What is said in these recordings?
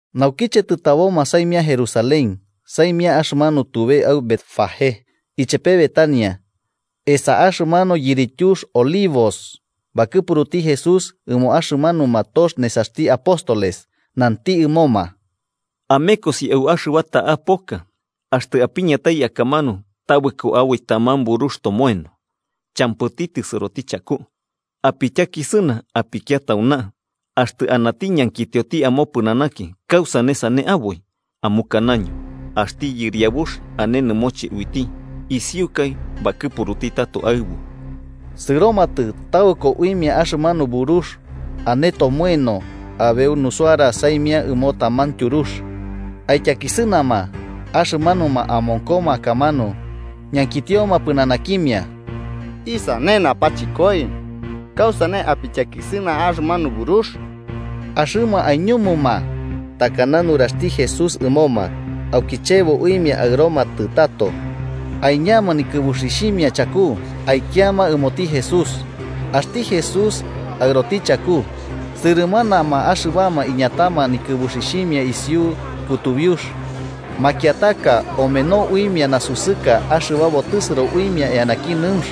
Naukiche tɨtaboma saimia Jerusalén, saimia axɨmanio tube au Betfagé ichepe Betania, esa axɨmanu yirityux Olivos, bakɨpuruti Jesús ɨmo axɨmanuma tox nesaxti apóstoles, nanti ɨmoma: –Amekosi au axɨba ta'a poka, axtɨ apiñatai akamanu tabɨko aboi taman burux tomoeno, champɨti tɨsɨroti chaku. Apityakisɨna apikia tauna. Axtɨ anati ñankitio amopɨnanaki kausane sane aboi, amukanaño: Axti Yɨriabux ane nɨmoche uiti isiukai bakɨpuruti tato aɨbu. Sɨromatɨ, tabɨko uimia axɨmanu burux ane tomoeno abeu nusuara saimia ɨmo taman tyurux, aityakisɨnama. Axɨmanuma amonkoma akamanu ñankitioma pɨnanakimia: –¿Isane napachɨkoi? ¿Kausane apityakisɨna axɨmanu burux? Axɨma aiñumuma takana nuraxti Jesús ɨmoma. Auki chebo uimia aɨromatɨ tato. Aiñama nikɨbuxixhimia chaku, aikiama ɨmoti Jesús. Axti Jesús aɨroti chaku. Sɨrɨmanama axɨbama iñatama nikɨbuxixhimia isiu kutubiux, makiataka omeno uimia nasusɨka axɨba botɨsɨro uimia eanaki nɨunx.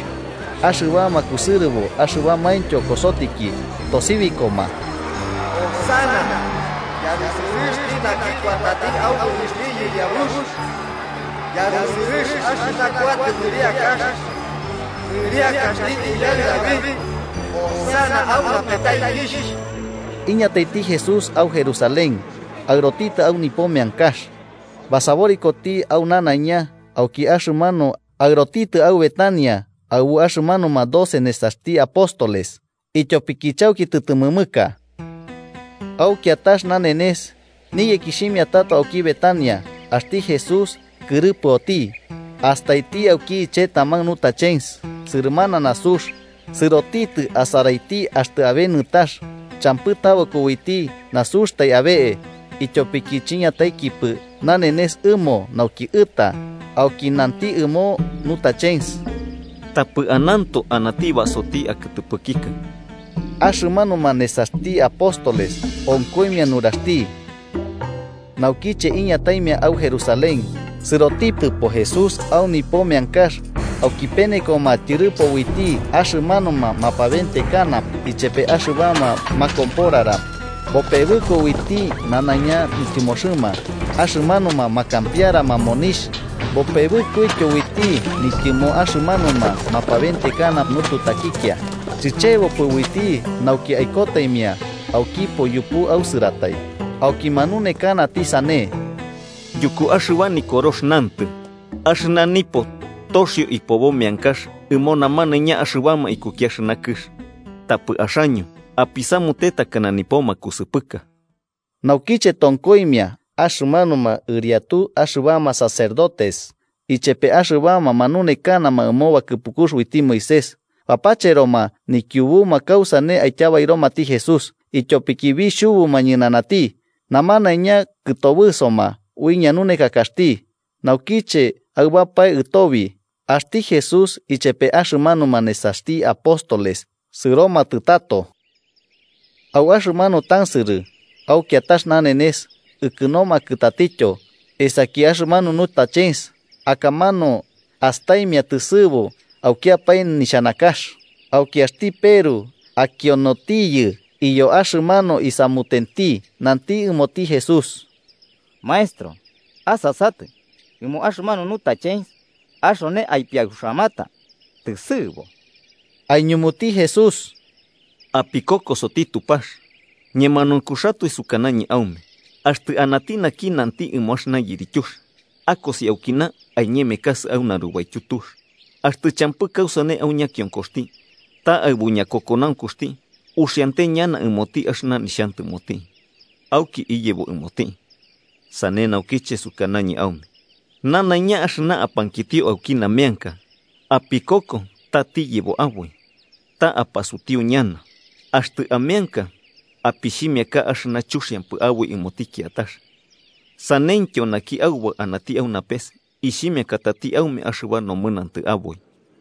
Axɨbama kusɨrɨbo axɨbamaintyo kosotiki, tosibikoma: –¡Hosana! ¡Yarusɨrɨxti naki kuatati au nɨrixhti Yɨriabux! ¡Yarusɨrɨx axɨna kuatɨ nɨriakax, nɨriakaxti uyaɨ David! ¡Hosana au napetaikixh! Iñataiti Jesús au Jerusalén aɨrotitɨ au nipo meankax. Basaborikoti au nanaiña auki axɨmanu aɨrotitɨ au Betania aɨbu axɨmanuma doce nesaxti apóstoles, ityopiki chauki tɨtɨmɨmɨka. Au kiatax nanenes, niyekixhimia tato auki Betania, axti Jesús kɨrɨpɨoti. Astaiti auki iche taman nutachens sɨrɨmana nasux, sɨrotitɨ asaraiti axtɨ abe nɨtax, champɨ tabɨko uiti nasuxtai abe'e, ityopiki chiñataikipɨ nanenes ɨmo nauki ɨta. Auki nanti ɨmo nutachens: –¡Tapɨ ananto anati basoti akɨtɨpɨkikɨ! Axɨmanuma nesaxti apóstoles onkoimia nuraxti. Naukiche iñataimia au Jerusalén, sɨrotitɨpo Jesús au nipo meankax auki penekoma tyɨrɨpo uiti axɨmanuma mapaventekana ichepe axɨbama makomporara. Bopebɨko uiti nanaiña nityɨmoxɨma axɨmanuma makampiarama monixh, bopebɨkoityo uiti nityɨmo axɨmanuma mapabentekana nututakikia. Chichebopɨ uiti nauki aikotaimia aukipo yupu ausɨratai. Auki manunekanati, sane: –Yuku axɨba Nikorox nantɨ: ‘Axɨna nipo toxio ipobo meankax ɨmo namanaiña axɨbama ikuki axɨna kɨx’, tapɨ axaño apisamute takana nipo makusɨpɨka. Naukiche tonkoimia, axɨmanuma ɨriatu axɨbama sacerdotes ichepe axɨbama manunekanama ɨmo bakɨpukux uiti Moisés bapacheroma nikiubuma kausane aityabairomati Jesús, ityopiki bixhubuma ñɨnanati, namanaiña kɨtobɨsoma ui ñanunekakaxti. Naukiche aɨbapae ɨtobi, axti Jesús ichepe axɨmanuma nesaxti apóstoles sɨromatɨ tato. Au axɨmanu tansɨrɨ au kiatax nanenes ikɨnomakɨ tatityo esaki axɨmanu nutachens, akamanu astaimia tɨsɨ'ɨbo aukiapae nixhanakax. Auki axti Peru, akionotiyɨ iyo axɨmanu isamutenti, nanti ɨmoti Jesús: –Maestro, asasatɨ, ɨmo axɨmanu nutachens axone aipiauxamata tɨsɨ'ɨbo. Aiñumuti Jesús: –Apikokosoti Tupax. Ñemanaunkuxatoe sukanañɨ aume axti anati naki nanti ɨmo axɨna yirityux: ‘¡Akosi aukina aiñemekasɨ au narubaityu tux!’, axtɨ champɨ kausane au ñakionkoxti, ta aɨbu ñakokonaunkuxti uxiante ñana ɨmoti axɨna nixhantɨmoti, auki iyebo ɨmoti. Sane naukiche sukanañɨ aume nanaiña axɨna apankitio auki nameanka, apikoko ta tiyebo aboi, ta apasutiu ñana. Axtɨ ameanka, apixhimiaka axɨna chuxiampɨ aboi ɨmoti kiatax, sanentyo naki Aubaɨ anati au napes ixhimiakatati aume axɨba nomɨnantɨ aboi.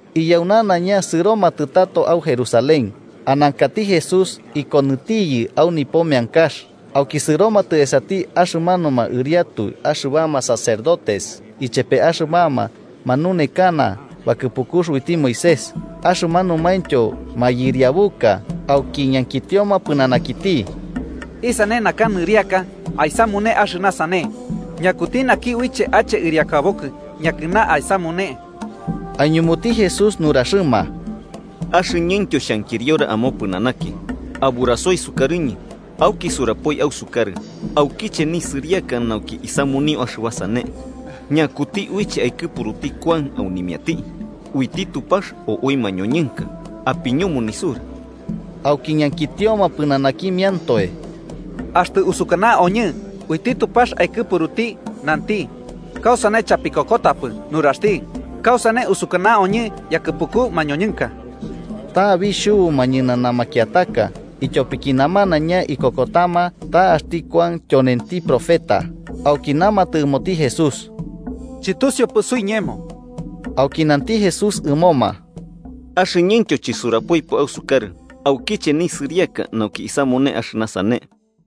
Iyau nanaiña sɨromatɨ tato au Jerusalén. Anankati Jesús ikonɨtiyɨ au nipo meankax, auki sɨromatɨ esati axɨmanuma ɨriatu axɨbama sacerdotes ichepe axɨbama manunekana bakɨpukux uiti Moisés, axɨmanumaintyo mayɨriabuka, auki ñankitioma pɨnanakiti: –¿Isane naka nɨriaka aisamune axɨna sane? ¿Ñakuti naki uiche ache ɨriakabokɨ yakɨna aisamune? Aiñumuti Jesús nuraxɨma: –Axɨñɨntyo xhankiriora amopɨnanaki. Aburasoi sukarɨñɨ, auki surapoi ausukarɨ aukiche nisɨriaka nauki isamunio axɨba sane. Ñakuti uiche aikɨpuruti Kuan aunimiati, ¿uiti Tupax o ui mañoñɨnka? Apiñumu nisura. Auki ñankitioma pɨnanakimiantoe: “Axtɨ usukana oñɨ, uiti Tupax aikɨpuruti, nanti: ‘¿Kausane, chapikokotapɨ nuraxti?’ ¿Kausane usukanaoñɨ yakɨpuku mañoñɨnka?...” Ta bixhubuma ñɨnana makiataka, ityopiki namanaiña ikokotama ta axti Kuan tyonenti profeta. Auki namatɨ ɨmoti Jesús: –Chɨtusiupɨ suiñemo. Auki nanti Jesús ɨmoma: –Axɨñɨntyo chɨsurapoipɨ ausukarɨ aukiche nisɨriaka nauki isamune axɨna sane.